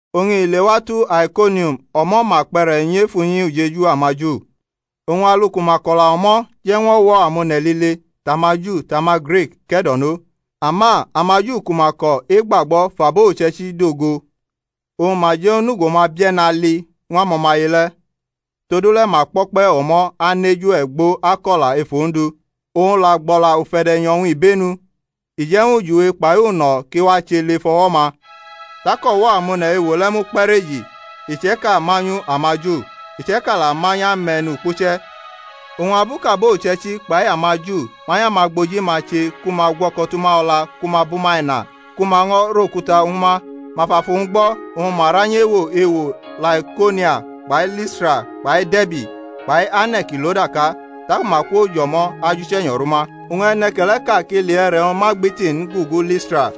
Oñ i lewatu Aikonium o̩mo̩ ma kpe̩re̩ nyʼef unyi ujeju amaju, oñ alu ku ma ko̩la o̩mo̩ je̩ ñw o̩wo̩ amone̩ lile, tʼamaJu tʼamaGrik, ke̩do̩no. Ama amaju ku ma ko̩ egbagbo̩ fʼabo uche̩ichi dogo oñ ma je̩ ñw onugo-ma bie̩ne̩ ali ñw amo̩maye le̩. Todule̩ ma kpo̩kpe̩ o̩mo̩ anʼeju e̩gbo ako̩la ef Ondu. Owñ la gbʼo̩la ufe̩de̩nyo̩-wñ ibenu, i je̩ ñw ujiwe kpai uno̩ ki wache lef o̩wo̩-ma. Tak o̩wo̩ amone̩ ewo le̩ mukpe̩reji; iche̩ka manyu amaju, iche̩ka la manyʼame̩nukpuche̩. Oñ abu kʼabo uche̩ichi kpai amaJu manyʼamagboji-ma che ku ma gwo̩ko̩ tʼuma o̩la ku ma bʼuma ina ku ma ño̩ rʼokuta ñw uma, ma fʼafu-wñ gbo̩ oñ ma ra nyʼewo ewo Laikaonia kpai Listra kpai De̩rbi, kpai ane̩ ki lo daka. Taku ma kwo jʼo̩mo̩ ajʼUche̩nyo̩ rʼuma. Oñ e̩ne̩ke̩le̩ʼka kʼili e̩re̩-wñ ma gbiti n gugu Listra,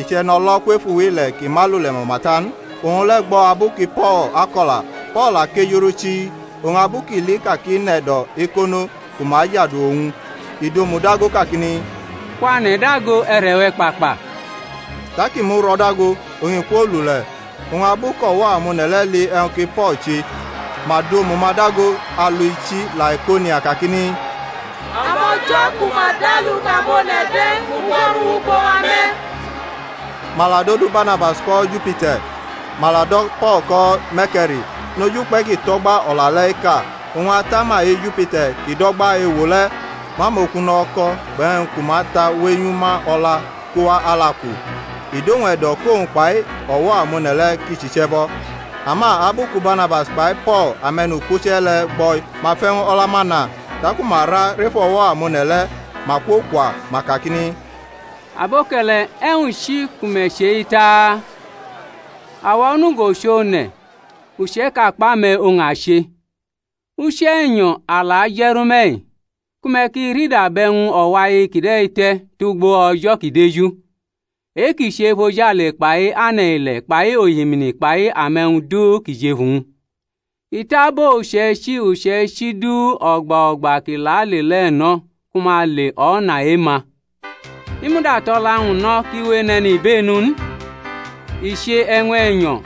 i chʼe̩no̩lo̩ kwef uwile̩ kʼi ma lule̩ mama ta n. Owñ le̩ gbo̩ abu ki Po̩l ako̩la: Po̩l la kejurʼu chii, oñ abu kʼi li ka kʼi nʼe̩do̩ ekono ku ma ajadu owñ, i dʼomu dago kakini, Kwane̩ dago e̩re̩-we̩ kpakpa. Tak i muro̩ dago, oñ i kwolule̩. Oñ abu kʼo̩wo̩ amone̩ le̩ li e̩wñ ki Po̩l che, ma dʼomu-ma dago alu ichi Laikaonia kakini, Amo̩jo̩ ku ma dʼalu kʼamone̩ de̩ mugwo̩ru wʼugbo wa me̩! Ma la dodu Barnabas ko̩ Jupiter; ma la do̩ Po̩l ko̩ Me̩rke̩ri, noj ukpe̩ kʼi tʼo̩gba o̩la le̩ eka. Oñ atama e-Jupiter kʼi do̩gba ewo le̩ mʼamokuno̩ o̩ko̩ kpai e̩wñ ku ma ta wenyu ma o̩la kowa alu-aku, i dʼowñ e̩do̩ kʼowñ kpai o̩wo̩ amone̩ le̩ ki chʼiche̩bo̩. Ama abu ku Barnabas kpai Po̩l ame̩nukpuche̩ le̩ gbo̩-i, ma fʼe̩wñ o̩la-ma na, taku ma ra ref o̩wo̩ amone̩ le̩ ma kwokwa, ma kakini, Aboke̩le̩, e̩wñ chi ku me̩ chʼei taa? awa onugo chʼone̩, uche̩ʼka kpʼame̩ oñ a che, Uche̩nyo̩ a la je̩ru me̩-i ku me̩ ki rida bʼe̩wñ o̩wai kide̩ te̩ tugbo O̩jo̩ ki deju, e-kʼi che efojale kpai ane̩-ile̩ kpai ohimini kpai ame̩wñ du ki jʼefu-wñ. I tʼabo uche̩ichi uche̩ichi duu o̩gba o̩gba ki la le le̩ no̩ ku ma le o̩na e-ma. I muda tʼo̩la-wñ no̩ kʼi we enʼe̩nibenu n, i che e̩wñ e̩nyo̩,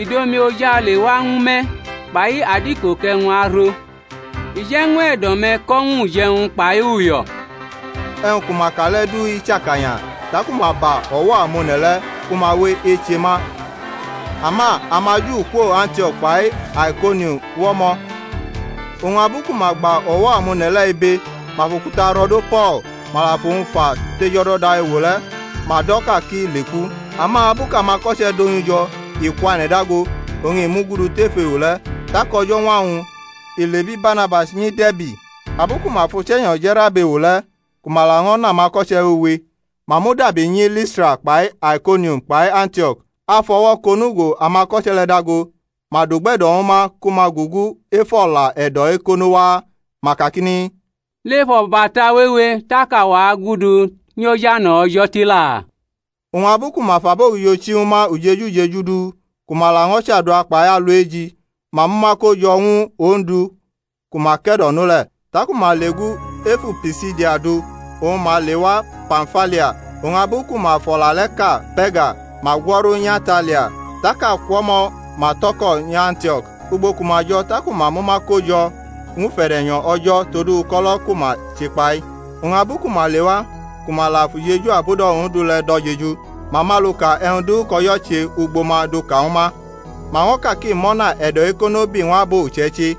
i du omi ojale wa ñwu me̩ kpai adiko kʼe̩wñ aro, i je̩ ñw e̩do̩-me̩ ko̩ ñw uje̩wñ kpai uyo̩. E̩wñ ku ma ka le̩ du i chakanya taku ma ba o̩wo̩ amone̩ le̩, ku ma we eche ma. Ama amaJu kwo Antio̩k kpai Aikonium wʼo̩mo̩; oñ abu ku ma gba o̩wo̩ amone̩ le̩ ibe, ma fʼokuta ro̩do Po̩l, ma la fʼowñ fa tʼejo̩do̩da ewo le̩, ma do̩ ka kʼi leku. Ama abu kʼamako̩che̩ donyʼu jo̩, i kwane̩ dago, oñ i mugudu tef ewo le̩. Tak o̩jo̩ñwa-wñ i lebi Barnabas nyi De̩rbi. Abu ku ma fʼUche̩nyo̩ je̩rʼab ewo le̩, ku ma laño̩ nʼamako̩che wewe, ma mudabi nyi Listra kpai Aikonium kpai Antio̩k, afʼo̩wo̩ kʼonugo amako̩che̩ le̩ dago; ma dʼugbe̩do̩ ñwu ma ku ma gugu ef o̩la e̩do̩ ekono waa, ma kakini, lef o̩bata wewe tak awa agudu nyi ojane̩ O̩jo̩ tila. Oñ abu ku ma fʼabogijo chi ñwu ma ujeju ujeju du, ku ma laño̩ chadua kpai alu eji, ma mʼuma ko jo̩ ñwu Ondu ku ma ke̩do̩no le̩. Tak uma legu ef Pisidia du oñ ma lewa Pamfilia. Oñ abu ku ma fʼo̩la le̩ ka Pe̩rga ma gwo̩ru nyʼAtalia; tak akwo̩mo̩ ma tʼo̩ko̩ nyʼAntio̩k, ugbo ku ma jo̩ taku ma mʼuma ko jo̩ ñw ufe̩de̩nyo̩ O̩jo̩ todu uko̩lo̩ ku ma chekpa-i. Oñ abu ku ma lewa ku ma la fʼujeju abudo̩ Ondu le̩ do̩ jeju, ma mʼaluka e̩wñ du kʼO̩jo̩ che ugbo ma duka ñwu ma, ma ño̩ kak i mʼo̩na e̩do̩ ekono bi ñw abo uche̩ichi.